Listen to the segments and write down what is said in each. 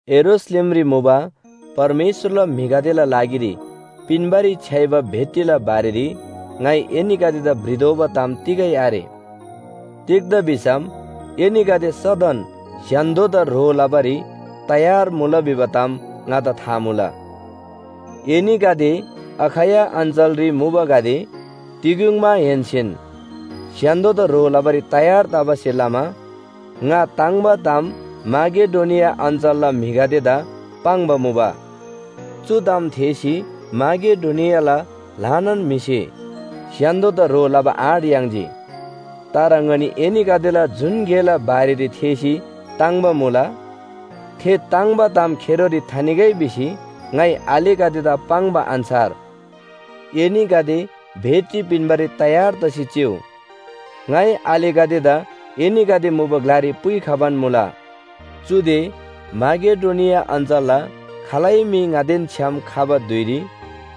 यरूशलेमरी मुबा परमेश्‍वरला म्‍हिगदेला लागिरी पिन्‍बारी छ्‌याइबा भेटीला बारेरी ङाइ एनीगदेदा भ्रितोःबा ताम तिगै आरे। तिग्‍दा भिसम एनीगदे सदन स्‍य्‍हान्‍दोदा ह्रो लबारी तयार मुला भिबा ताम ङादा था मुला। एनीगदे अखैया अञ्‍चलरी मुबागदे तिग्‍युङमाहेन्‍सेन स्‍य्‍हान्‍दोदा ह्रो लबारी तयार तबासे लमा ङा ताङ्‍बा ताम माकेडोनिया अञ्‍चलला म्‍हिगदेदा पाङ्बा मुबा। चु ताम थेःसी माकेडोनियाला ल्‍हानान म्‍हिसे स्‍य्‍हान्‍दोदा ह्रो लबा आँट याङ्जी। तर ङनी एनीगदेला जुन गेला बारेरी थेःसी ताङ्‍बा मुला। थे ताङ्‍बा ताम खेरोरी थानिगै भिसी ङाइ आलेगदेदा पाङ्बा अन्‍छार एनीगदे भेटी पिन्‍बारी तयार तसी चिउ। ङाइ आलेगदेदा एनीगदे मुबा ग्‍लारी पुइखबान मुला। चुदे माकेडोनिया अञ्‍चलला खालै म्‍हि ङादेन छ्‌याम खबा धुइरी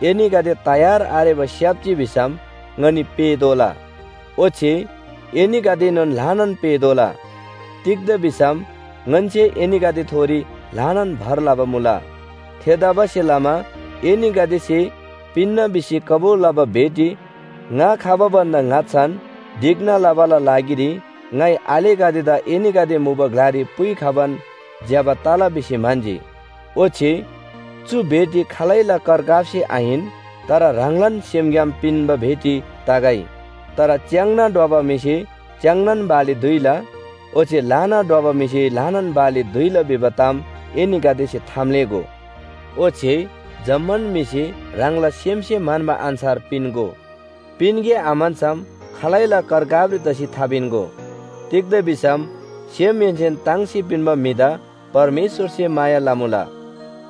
एनीगदे तयार आरेबा स्‍याप्‍जी भिसम ङनी पेःतोःला। ओच्‍छे एनीगदेएनोन ल्‍हानान पेःतोःला। तिग्‍दा भिसम ङन्‍से एनीगदेथोरी ल्‍हानान भर लबा मुला। थेतबासेलमा एनीगदेसे पिन्‍ना भिसी कबुल लबा भेटी ङा खबा भन्‍दा ङाच्‍छान ढिक्‍ना लबाला लागिरी ङाइ आलेगदेदा एनीगदे मुबा ग्‍लारी पुइखबान ज्‍यबा तला भिसी म्‍हन्‍जी। ओच्‍छे चु भेटी खालैला करकापसे आहिन, तर ह्राङलान सेमग्‍याम पिन्‍बा भेटी तगै। तर च्‍याङ्ना ढ्वबा म्‍हिसे च्‍याङ्नान बाली दुइला, ओच्‍छे ल्‍हाना ढ्वबा म्‍हिसे ल्‍हानान बाली दुइला भिबा ताम एनीगदेसे थाम्‍लेःगो। ओच्‍छे जम्‍मान म्‍हिसे ह्राङला सेमसे म्‍हन्‍बा अन्‍छार पिन्‍गो। पिन्‍गे आम्‍हन्‍सम खालैला करकापरी तसी थापिन्‍गो। तिग्‍दा भिसम सेमहेन्‍सेन ताङ्सी पिन्‍बा म्‍हिदा परमेश्‍वरसे माया लमुला।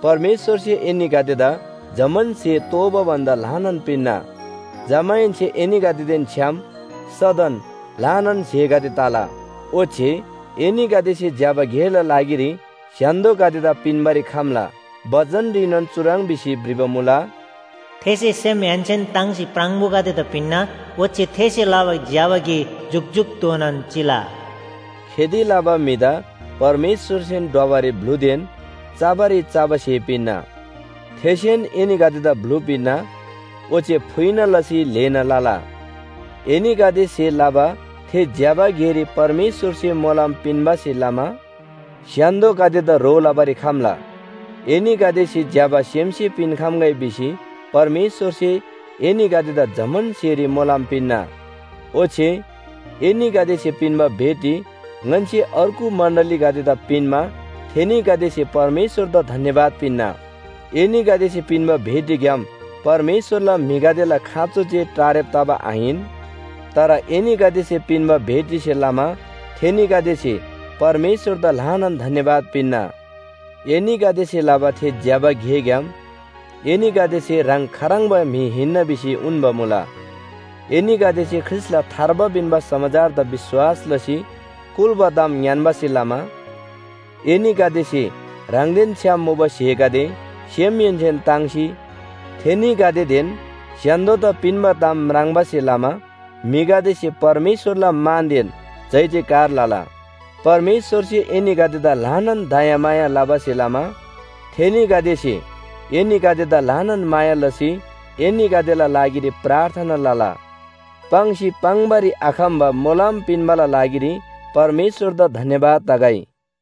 परमेश्‍वरसे एनीगदेदा जम्‍मान स्‍हे तोःबा भन्‍दा ल्‍हानान पिन्‍ना। जमाहेन्‍से एनीगदेदेन छ्‌याम सदन ल्‍हानान स्‍हेगदे तला, ओच्‍छे एनीगदेसे ज्‍यबा गेला लागिरी स्‍य्‍हान्‍दोगदेदा पिन्‍बारी खम्‍ला। बचनरीनोन चुह्रङ् भिसी भ्रिबा मुला, “थेसे सेमहेन्‍सेन ताङ्सी प्राङबोगदेदा पिन्‍ना। ओच्‍छे थेसे लबा ज्‍यबा गे जुकजुकधोनान चिला।” खेती लबा म्‍हिदा परमेश्‍वरसेन ढ्वबारी ब्‍लुदेन चबारी चबा स्‍हे पिन्‍ना, थेसेन एनीगदेदा ब्‍लु पिन्‍ना ओच्‍छे फुइना लसी ल्‍हेना लला। एनीगदेसे लबा थे ज्‍यबा गेरी परमेश्‍वरसे मोलम पिन्‍बासे लमा स्‍य्‍हान्‍दोगदेदा ह्रो लबारी खम्‍ला। एनीगदेसे ज्‍यबा सेमसे पिन्‍खम्‍गै भिसी परमेश्‍वरसे एनीगदेदा जम्‍मान स्‍हेरी मोलम पिन्‍ना। ओच्‍छे एनीगदेसे पिन्‍बा भेटी ङन्‍से अर्गु मण्‍डलीगदेदा पिन्‍मा थेनीगदेसे परमेश्‍वरदा धन्‍यवाद पिन्‍ना। एनीगदेसे पिन्‍बा भेटीग्‍याम परमेश्‍वरला म्‍हिगदेला खाँचो जे टारेब तबा आहिन। तर एनीगदेसे पिन्‍बा भेटीसे लमा थेनीगदेसे परमेश्‍वरदा ल्‍हानान धन्‍यवाद पिन्‍ना। एनीगदेसे लबा थे ज्‍यबा गेग्‍याम एनीगदेसे ह्राङ खाह्रङ्बा म्‍हि हिन्‍ना भिसी उन्‍बा मुला। एनीगदेसे ख्रीष्‍टला थार्बा पिन्‍बा समाचारदा विश्‍वास लसी कुल्‍बा ताम ङ्‌यान्‍बासे लमा, एनीगदेसे ह्राङदेन छ्‌याम मुबा स्‍हेगदे सेमहेन्‍सेन ताङ्सी थेनीगदेदेन स्‍य्‍हान्‍दोदा पिन्‍बा ताम म्राङ्बासे लमा म्‍हिगदेसे परमेश्‍वरला मानदेन जयजयकार लला। परमेश्‍वरसे एनीगदेदा ल्‍हानान दयामाया लबासे लमा थेनीगदेसे एनीगदेदा ल्‍हानान माया लसी एनीगदेला लागिरी प्रार्थना लला। पाङ्सी पाङ्‌बारी आखम्‍बा मोलम पिन्‍बाला लागिरी परमेश्‍वरदा धन्‍यवाद तगै।